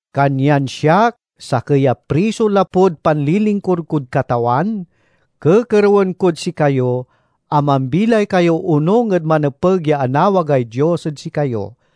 Kanyan siak, sakey a priso lapud panlilingkur kod Katawan, kekerewen kod sikayo a mambilay kayo onung ed manepeg ya anawagay Dios ed sikayo.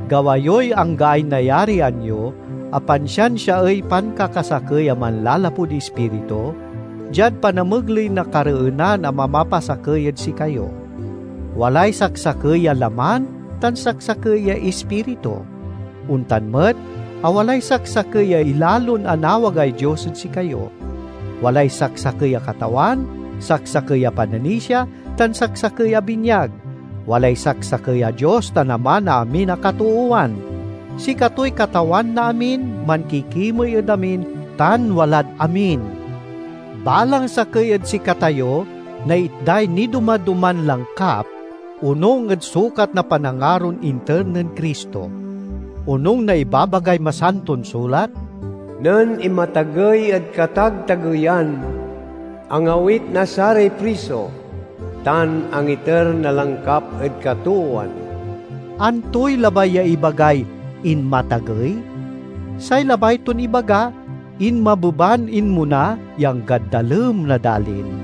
Gawa yoy anggaay nayarian yo a pansiansiaey pankakasakey a manlalapud Ispiritu, diad panamegley na kareenan a mamapasakey ed sikayo. Walay saksakey a laman tan saksakey ya Ispiritu; ontan met a walay saksakey ya ilalon anawagay Dios ed sikayo. Walay saksakey a Katawan, saksakey a pananisia, tan saksakey a binyag; walay saksakey a Dios tan Ama na amin a katoowan. Sikatoy Katawan na amin, mankikimey ed amin, tan walad amin. Balang sakey ed sikatayo naitday nidoma-doman langkap, onung ed sukat na panangaron inter nen Cristo. Onung na ibabagay Masanton Sulat, "Nen inmatagey ed katagtageyan angawit na saray priso; tan angiter na langkap ed katoowan." Antoy labay ya ibagay "inmatagey"? Say labay ton ibaga, inmabeban inmona ya anggad dalem na dalin.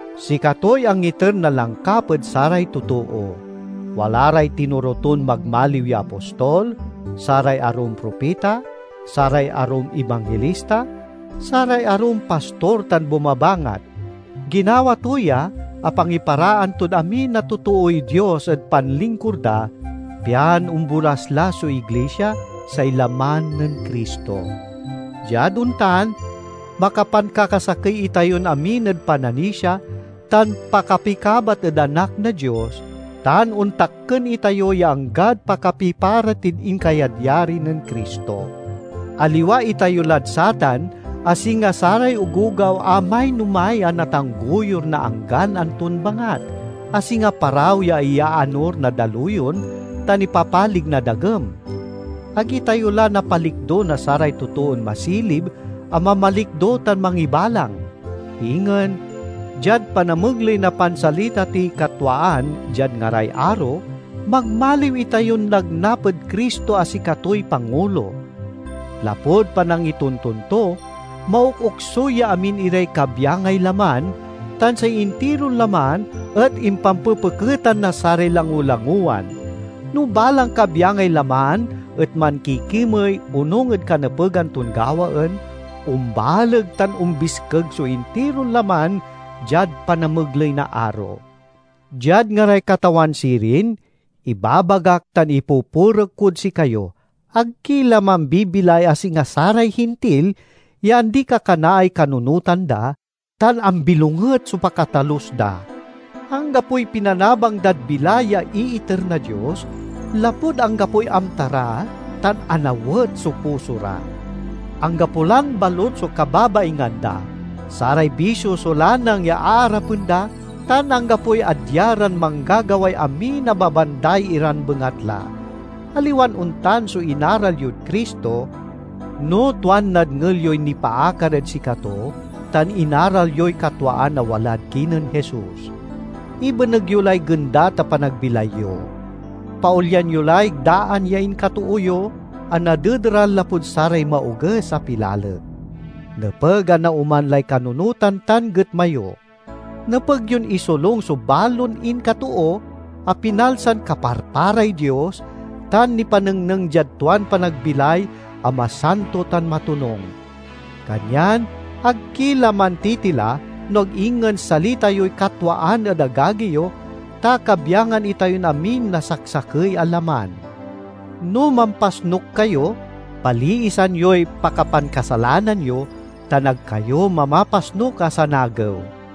Sikatoy angiter na langkap ed saray totoo; wala ray tinoro ton magmaliw ya apostol, saray arum propita, saray arum ibanghilista, saray arum pastor tan bumabangat. Ginawa to ya a pangiparaan tod amin a totooy Dios ed panlingkur da, pian ombolaslas so iglisia, say laman nen Cristo. Diad ontan, makapankakasakey itayon amin ed pananisia tan pakapikabat ed Anak na Dios, tan ontakken itayo ya anggad pakapipara tid inkayadyari nen Cristo. Aliwa itayo lad satan a singa saray ogogaw a mainomay a natanggoyur na anggan anton bangat—a singa paraw ya iyaanur na daluyon tan ipapalig na dagem. Ag itayo la napalikdo na saray totoon masilib a mamalikdo tan mangibalang. Ingen, diad panamegley na pansalita tiy katwaan diad ngaray aro, magmaliw itayon nagnap ed Cristo a sikatoy pangulo. Lapud panangitonton to, maokoksuy ya amin iray kabyangay laman, tan say intiron laman et impampepeketan na saray langolangowan. No balang kabyangay laman et mankikimey onung ed kanepegan ton gawaen, ombaleg tan ombiskeg so intiron laman diad panamegley na aro. Diad ngaray Katawan sirin, ibabagak tan ipupurek kod sikayo: ag ki la mambibilay a singa saray Hintil, ya andikakanaay kanunotan da tan ambilonget so pakatalus da. Anggapoy pinanabang dad bilay ya iiter na Dios, lapud anggapoy amta ra tan anawet so puso ra. Anggapo lan balut so kababaingan da, saray bisio so lanang ya aarapen da, tan anggapoy adya ran manggagaway amin a mabanday iran bengatla. Aliwan ontan so inaral yod Cristo, no tuan nadngel yoy nipaakar ed sikato tan inaral yoy katwaan a walad kinen Jesus. Ibeneg yo lay gendat a panagbilay yo. Paolyan yo lay daan ya inkatoo yo a nadedaral lapud saray maoges a pilalek. Nepeg a naoman lay kanunotan tan getma yo. Nepeg yon isolung so balon inkatoo, a pinalsan kaparparay Dios, tan nipanengneng diad tuan panagbilay a masanto tan matonung. Kanyan ag ki la mantitila, no ag ingen salita yoy katwaan ed agagi yo, ta kabyangan itayon amin na saksakey a laman. No mampasnuk kayo, paliisan yoy pakapankasalanan yo, tan ag kayo mamapasnuk a sanagew.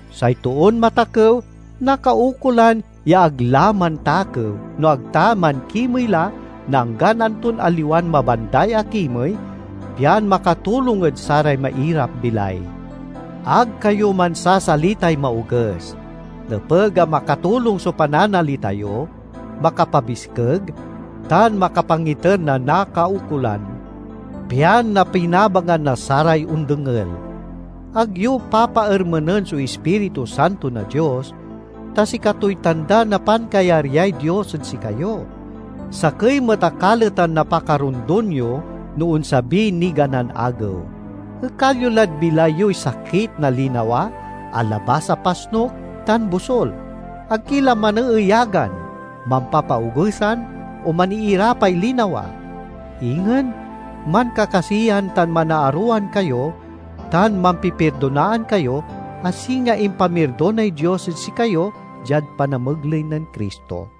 Say toon matakew nakaukolan ya ag la mantakew, no ag ta mankimey la na anggan anton aliwan mabanday a kimey, pian makatulong ed saray mairap-bilay. Ag kayo mansasalitay maoges. Nepeg a makatulong so pananalita yo, makapabiskeg, tan makapangiter na nakaukolan, pian napinabangan na saray ondengel. Ag yo papaermenen so Ispiritu Santo na Dios, ta sikatoy tanda na pankayaryay Dios ed sikayo; sakey met a kaletan na pakarondon yo no onsabiy niganan Agew. Ekal yo lad bilay yoy sakit na linawa, alabas a pasnuk tan bosul. Ag ki la maneeyagan, mampapaogesan, o maniirapay linawa. Ingen, mankakasiyan tan manaarowan kayo tan mampipirdonaan kayo, a singa impamirdonay Dios ed sikayo diad panamegley nen Cristo.